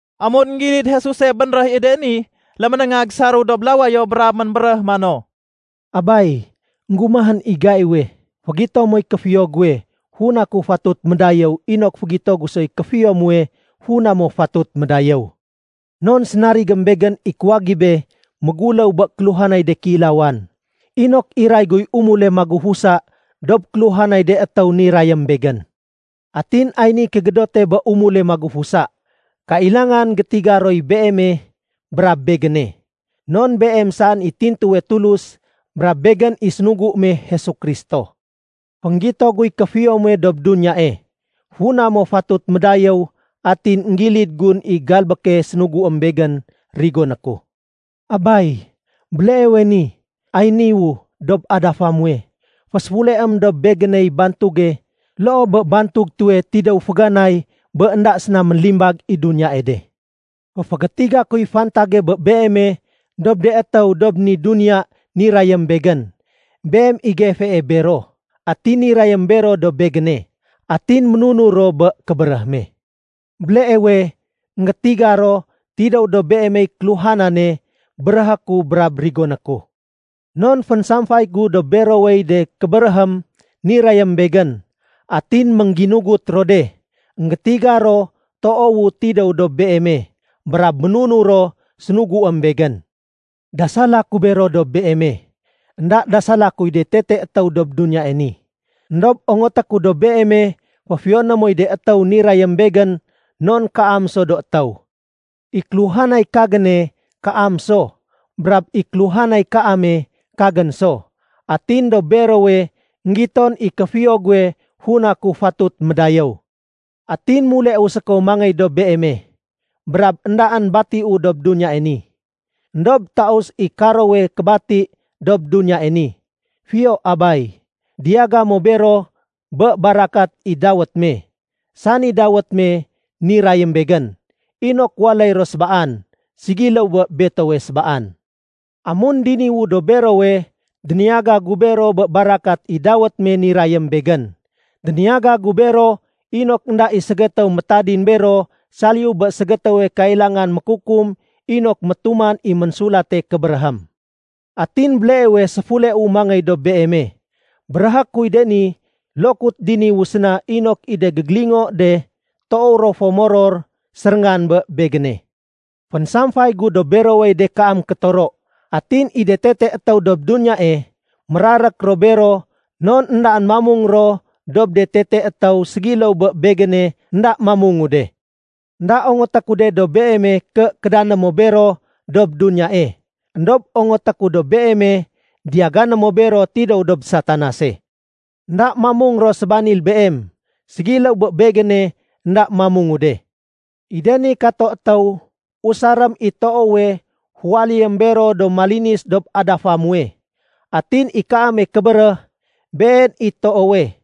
Amun énggilid Jesuse bénréh i de ni, léménéngag saréw dob lawayo brab ménbéréh mano, “Abay, énggumahén i gaiwe. Fégito moy kéfiyo guwe funa ku fatut médayéw inok fégito gu soy kéfiyo muwe funa mo fatut médayéw. Non sénarigém Begén i kuwagibé méguléw bé kéluhanay de kéilawan, inok iray guy umule magufusa dob kéluhanay de étéw nirayém Begén. Atin ay niy kégédote bé umule magufusa: kailangan gétiga roy Beeme brab Begéne, non Beem saén i tintuwe Tulus brab Begén i sénugu me Jesu Kristo. Fénggito guy kéfiyo muwe dob duniyae, funa mo fatut médayéw atin énggilid gun i galbéke sénuguém Begén rigoné ku. Abay, béleewe ni ay niwu dob adafa muwe, féséfuleém dob Begéney bantuge loo bé bantug tuwe tidéw féganay bé énda séna ménlimbag i duniyae de. “Féfégétiga kuy fantage bé Beeme dob de étéw dob ni duniya nirayém Begén. Beem i gefee bero, atin nirayém bero dob Begéne, atin ménunur ro bé kébéréh me. Béleewe énggétiga ro tidéw dob Beemey kéluhanane béréhé ku brab rigoné ku. Non fénsamfay gu dob berowey de kébéréhém nirayém Begén, atin méngginugut ro de. Enggétiga ro toowu tidéw dob Beeme, brab ménunur ro sénuguém Begén. “Dasala ku bero dob Beeme. Enda dasala kuy de tete étéw dob duniyae ni, éndob ongoté ku dob Beeme féfiyoné moy de étéw nirayém Begén non kaam so do étéw. I kéluhanay kagéne kaam so, brab i kéluhanay kaame kagén so. Atin dob berowe énggiton i kéfiyo guwe funa ku fatut médayéw. Atin muleu séko mangéy dob Beeme, brab éndaén batiu dob duniyae ni. Endob taus i karowe kébati dob duniyae ni. Fiyo Abay, diyaga mo bero bé barakat i dawét me, sani dawét me nirayém Begén, inok waléy ro sébaan, ségiléw bé betowe sébaan. Amun diniwu dob berowe, déniyaga gu bero bé barakat i dawét me nirayém Begén. Déniyaga gu bero inok énda i ségétéw métadin bero saliyu bé ségétéwe kailangan mékukum inok métuman i Ménsulate Kébéréhém. Atin béleewe séfuleu mangéy dob Beeme. Béréhé kuy de ni lokut diniwu séna inok i de gégélingo de toow ro fo moror séréngan bé Begéne. Fénsamfay gu dob berowey de kaam kétoro. Atin i de tete étéw dob duniyae, mérarék ro bero non éndaén mamung ro dob de tete étéw ségiléw bé Begéne énda mamungu de. Enda ongoté ku de dob Beeme ké kédané mo bero dob duniyae, éndob ongoté ku dob Beeme diyagané mo bero tidéw dob Satanase. Enda mamung ro sébanil Beem ségiléw bé Begéne énda mamungu de. I de ni kato étéw, usarém i toowe féwaléyém bero do malinis dob adafa muwe. Atin i kaame kébéréh, been i toowe.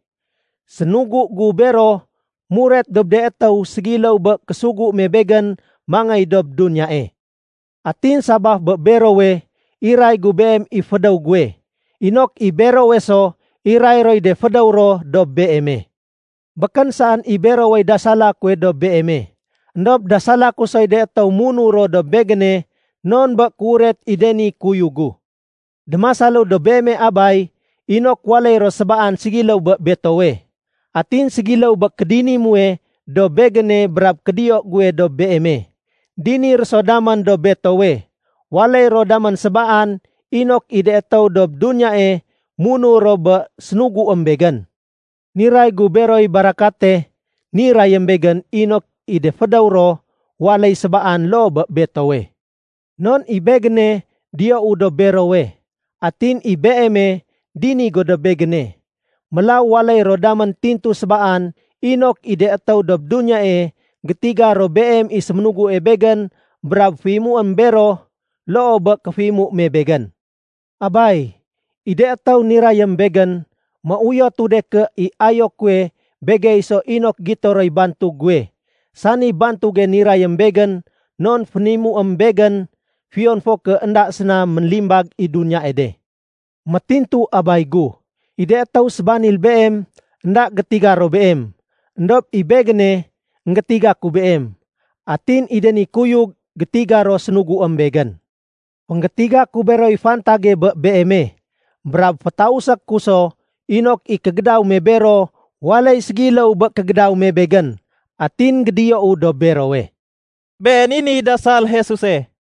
Sénugu gu bero muret dob de étéw ségiléw bé késugu me Begén mangéy dob duniyae. Atin sabaf bé berowe, iray gu Beem i fédéw guwe, inok i berowe so iray roy de fédéw ro dob Beeme. “Békén saén i berowey dasala kuwe dob Beeme, éndob dasala ku soy de étéw munur ro dob Begéne non bé kéuret i de ni kuyug gu. Démasalu dob Beeme Abay inok waléy ro sébaan ségiléw bé Betowe. Atin ségiléw bé kédini muwe dob Begéne brab kédiyo guwe dob Beeme, dini ro so damén dob Betowe. Waléy ro damén sébaan inok i de étéw dob duniyae munur ro bé sénuguém Begén. Niray gu beroy barakate nirayém Begén inok i de fédéw ro waléy sébaan loo bé Betowe. Non i Begéne diyou dob berowe, atin i Beeme dini go dob Begéne. Mélaw waléy ro damén tintu sébaan inok i de étéw dob duniyae gétiga ro Beem i séménugu Begén brab féimuém bero loo bé kéféimu me Begén. “Abay, i de étéw nirayém Begén, méuyotu de ké i ayo kuwe begey so inok gito roy bantug guwe, sani bantuge nirayém Begén non fénimuém Begén fiyon fo ké énda séna ménlimbag i duniyae de. Métintu Abay gu, i de étéw sébanil Beem, énda gétiga ro Beem. Endob i Begéne énggétiga ku Beem. Atin i de ni kuyug, gétiga ro sénuguém Begén. Fénggétiga ku beroy fantage bé Beeme, brab fétausé ku so inok i kégédaw me bero waléy ségiléw bé kégédaw me Begén, atin gédiyou dob berowe.” Been i niy dasal Jesuse.